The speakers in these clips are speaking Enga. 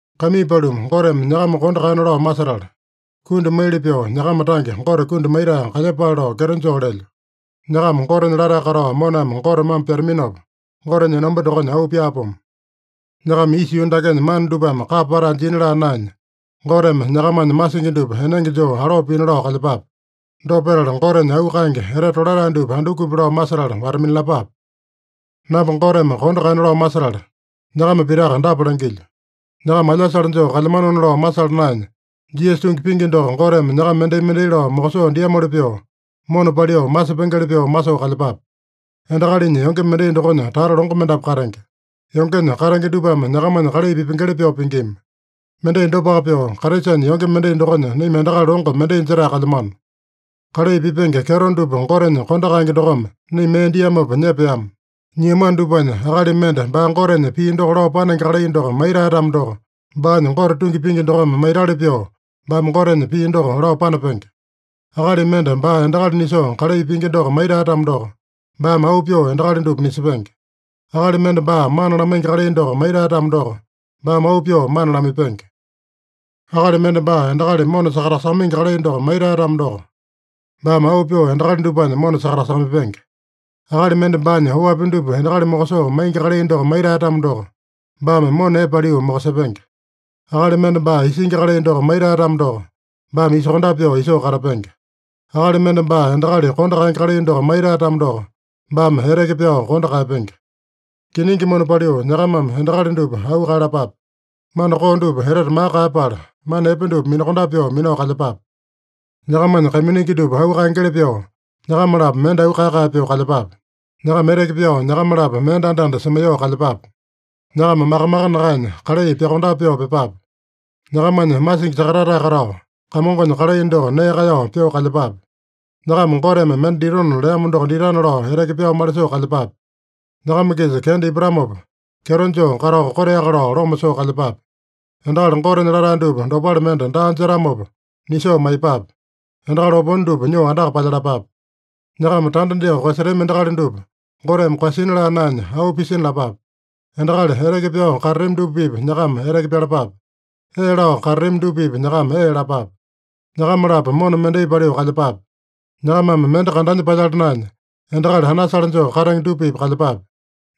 Kaimii paluma, Goteme nyakama kondo kaeyana lao masetala, kundi maili pyoo nyakama tange Gote kundi maitae kalyepale lao kyeto joo lelyo. Nyakama Gotenya latae katao moname Gote mambo pyataminopa, Gotenya enomba dokonya auu pyaapomo. Nyakama isa yuu dakenya mana dupame kapa patae jina laa naenya, Goteme nyakamanya masingi dupa enenge joo aloo pina lao kalyepape. Dopa petala, Gotenya auu kaenge, etete tolatae dupa andukupi lao masetala wata-minalapape. Namba Goteme kondo kaeyana lao masetala, nyakama pitaka dapa langilyo: Nyakama alyasale joo kalyamanona lao masala naenya, Jisasa tungi pingi doko Goteme nyakama mendai-mendai lao mokosoo diamoli pyoo, mona paliu masepengeli pyoo masoo kalyepape. Endakalinya yonge mendai dokonya tata longo mendapu katenge. Yongenya katenge dupame nyakamanya kalai pipengeli pyoo pingima. Mendai dopaka pyoo, Kraisanya yonge mendai dokonya naima endakali longo mendai jetae kalyamano. Kalai pipenge kyeto dupa Gotenya kondo kaenge dokome naima mee diamopa nyepeama. Nyiamano dupanya, akali mende baa Gotenya pii doko lao panenge kalai doko maitae-tamo doko, baanya Gote tungi pingi dokome maitali pyoo, baame Gotenya pii doko lao panapenge. Akali mende baa endakali nisoo kalai pingi doko maitae-tamo doko, baame auu pyoo endakali dupa nisepenge. Akali mende baa mana lamaingi kalai doko maitae-tamo doko, baame auu pyoo mana lamaipenge. Akali mende baa endakali mona sakatasakamaingi kalai doko maitae-tamo doko, baame auu pyoo endakali dupanya mona sakatasakamaipenge. Akali mende baanya oapi dupa endakali mokosoo maingi kalai doko maitae-tamo doko, baame mona epe paliu mokosepenge. Akali mende baa isingi kalai doko maitae-tamo doko, baame isokondape pyoo isoo katapenge. Akali mende baa endakali kondo kaenge kalai doko maitae-tamo doko, baame eteke pyao kondo kaeyapenge. Kiningi mona paliu nyakamame endakali dupa auu kaeyalapape. Mana koo dupa etete maka kaeyapala, mana epe dupa minakondape pyoo minao kalyepape. Nyakamanya kaiminingi dupa auu kaengeli pyoo, nyakama-lapo mende auu kae-kae pyoo kalyepape. Nyakama eteke pyao nyakama-lapo mende anda-anda semaiyoo kalyepape. Nyakama maka-maka nakaenya, kalai pyokondape pyoo pyepape. Nyakamanya masingi sakatatae katao, Kamongonya kalai doko nee kaeyao pyoo kalyepape. Nyakama Goteme mende ditona leamo doko ditana lao eteke pyao malisoo kalyepape. Nyakama-kisa kenda ipatamopa, kyeto joo katao koteaka lao loma soo kalyepape. Endakali Gotenya latae dupa dopale mende daa jetamopa nisoo maiyepape. Endakali opone dupa nyoo andaka palyalapape. Nyakama tanda dyoo koeyasetami endakali dupa Goteme koeyasina laa naenya, auu pisina lapape. Endakali eteke pyao katatami dupa-pipa nyakama eteke pyalapape. Ee lao katatami dupa-pipa nyakama ee lapape. Nyakama-lapo mona mendai paliu kalyepape. Nyakamame mende kandanya palyala naenya, endakali anasale joo katenge dupa-pipa kalyepape.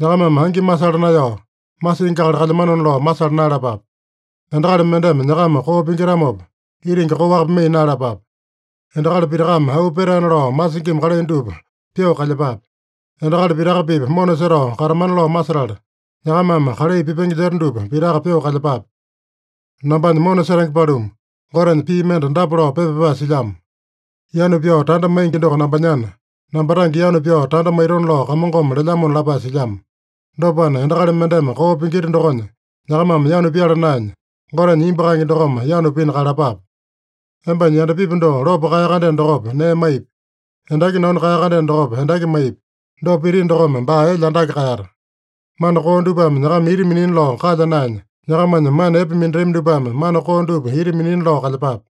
Nyakamame angi masala naeyao, masingi akali kalyamanona lao masala naeyalapape. Endakali mendeme nyakama koo pingitamopa, itingi koaka pimaiya naeyalapape. Endakali pitakame auu petaena lao masingima kalai dupa pyoo kalyepape. Endakali pitaka-pipa mona setao katamana lao masetala, nyakamame kalai pipenge jeta dupa pitaka pyoo kalyepape. Nambanya mona setenge paluma, Gotenya pii mende dapa lao pepa pyapae silyamo: “Yanu pyao tanda maingi doko nambanyana, namba tange yanu pyao tanda maitona lao Kamongome lelyamona” lapae silyamo. Dopana, endakali mendeme koo pingita dokonya nyakamame yanu pyala naenya, Gotenya imbu kaenge dokome yanu pina kaeyalapape. “Embanya yandapipi doko lopo kaeya-kandeno dokopa, nee maipi. Endaki nanu kaeya-kandeno dokopa, endaki maipi. Dopa pitino dokome baa elya andake kaeyata.” Mana koo dupame nyakama ita minina lao kalya naenya, nyakamanya mana epe minatami dupame mana koo dupa ita minina lao kalyepape.